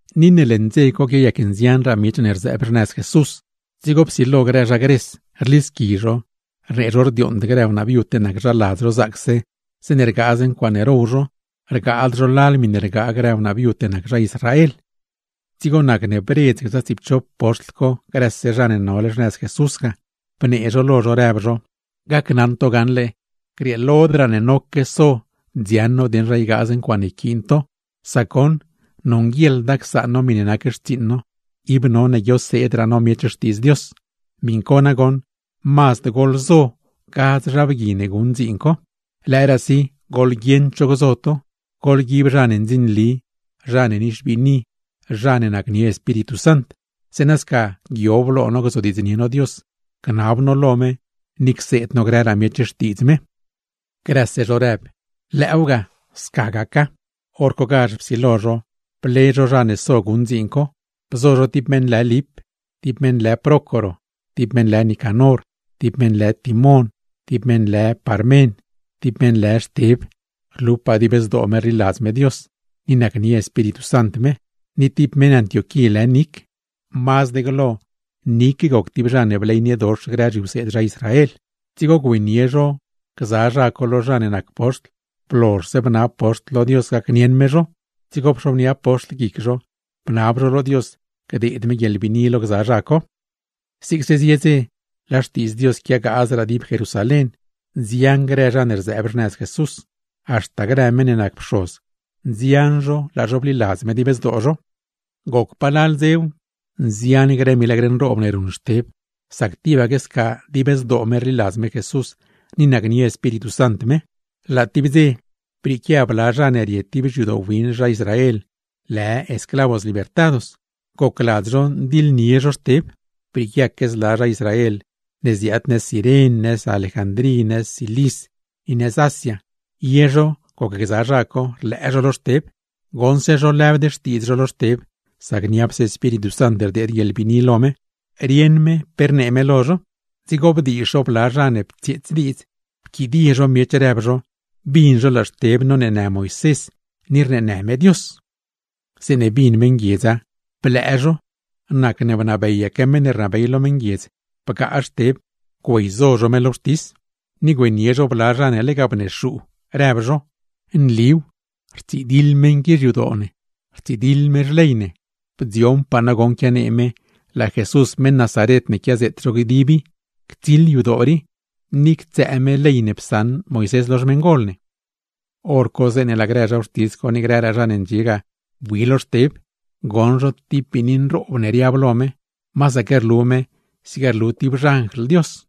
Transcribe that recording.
Ni ne leṉ dze co quiayac nzianraa miech ne rzëëb xnëz Jesús, dzigo psilo grë zha Gres rlisqui zho, rnee zho rdiooṉd grë wnaa viud ne nac zha ladz zho zaacse; zeeṉe rgaaz ncuaaṉe row zho, rgaad zho lal miṉe rgaa grë wnaa viud ne nac zha Israel. Dzigo nacne bredz gza tsiipchop poxtl co grëse zha ne nole xnëz Jesús ga, bnee zho lo zho rëb zho: ―Gacnaṉ to gaṉle, grieelodraa ne noque so dziaṉ no dieṉ zha ygaaz ncuaaṉe yquiin to, sac goṉ nonguieḻda csaan no miṉe nac xtsiiṉ no, ib none guioseedraa no miech Xtiidz Dios. Miṉ co nagoṉ, mazd goḻzo gadz zha bgui ne guṉ dziin co, lëëraasi goḻguieṉ cho gzo to; goḻguib zha ne ndzinli, zha ne nixbiini, zha ne nacnie Espíritu Sant; zeeṉa sca guiob lo no gzodiidznie no Dios, gnab no lo me, ni cseed no grëraa miech Xtiidz me. Grëse zho rëb, wen sca gaca. Horcogazh psilo zho ble zho zha ne so guṉ dziin co. Bzo zho tib meṉ lë Lip, tib meṉ lë Prócoro, tib meṉ lë Nicanor, tib meṉ lë Timon, tib meṉ lë Parmen, tib meṉ lë Xteb, rlupaa dib zdoo me rliladz me Dios ni nacnie Espíritu Sant me; ni tib meṉ Antioquí lë Nic, mazd glo Nic goc tib zha ne bleyniedox grë zhiwseed zha Israel. Dzigo güeynie zho gza zha co lo zha ne nac poxtl. Blozhse bnab poxtl lo Dios gacnieṉ me zho, dzigo pxobnia poxtl guic zho, bnab zho lo Dios gdeed me guieḻbiini lo zho. Zigse zie dze, laa Xtiidz Dios quiagaazraa dib Jerusalén. Nzian grë zha ne rzëëb xnëz Jesús, haxta grë meṉ ne nac pxoz, nzian zho laa zho bliladz me dib zdoo zho. Goc palal dzew, nzian grë milagr nroob ne ruṉ Xteb, sac tibaque sca dib zdoo me rliladz me Jesús, ni nacnie Espíritu Sant me. Laa tib dze, brieequia bla zha ne rie tib xyadoo win zha Israel, lë “Esclavos Libertados” gocladz zho ndiḻdiidznie zho Xteb. Brieeque zla zha Israel ne ziaad nëz Ciren, nëz Alejandrí, nëz Cilis, ni nëz Asia, ye zho gocgza zha co rlëë zho lo Xteb. Goṉse zho rlëbd xtiidz zho lo Xteb, sac niapse Espíritu Sant rdeed guieḻbiini lo me, rieṉ me pe rnee me lo zho; dzigo bdiizh zho bla zha ne ptsieets diidz, pquidie zho rëb zho bin zho laa Xteb noneenë Moisés ni rneenë me Dios. Zeeṉe bin meṉguiedza, blëë zho; nacne bnabeyaque zha ne rnabey lo meṉguiedz bgaa Xteb güeyzo zho me lo wxtis. Ni güeynie zho bla zha ne lega bnexuu, rëb zho: ―Nliw, rtsidiḻ mgui qui xyadoo ne, rtsidiḻ me xley ne. Bdzioṉpaa no goṉ quianee me laa Jesús meṉ Nazaret ne quiazeet zho dib i ctsiḻ yadoo rii, ni ctsëë me ley ne psaṉ Moisés lo xmeṉgol ne. Horco zeeṉe laa grë zha wxtis co ni grëraa zha ne ndxie ga bui lo Xteb, goṉ zho tib biini nroob ne riab lo me, masaque rlu me zig rlu tib xanjl Dios.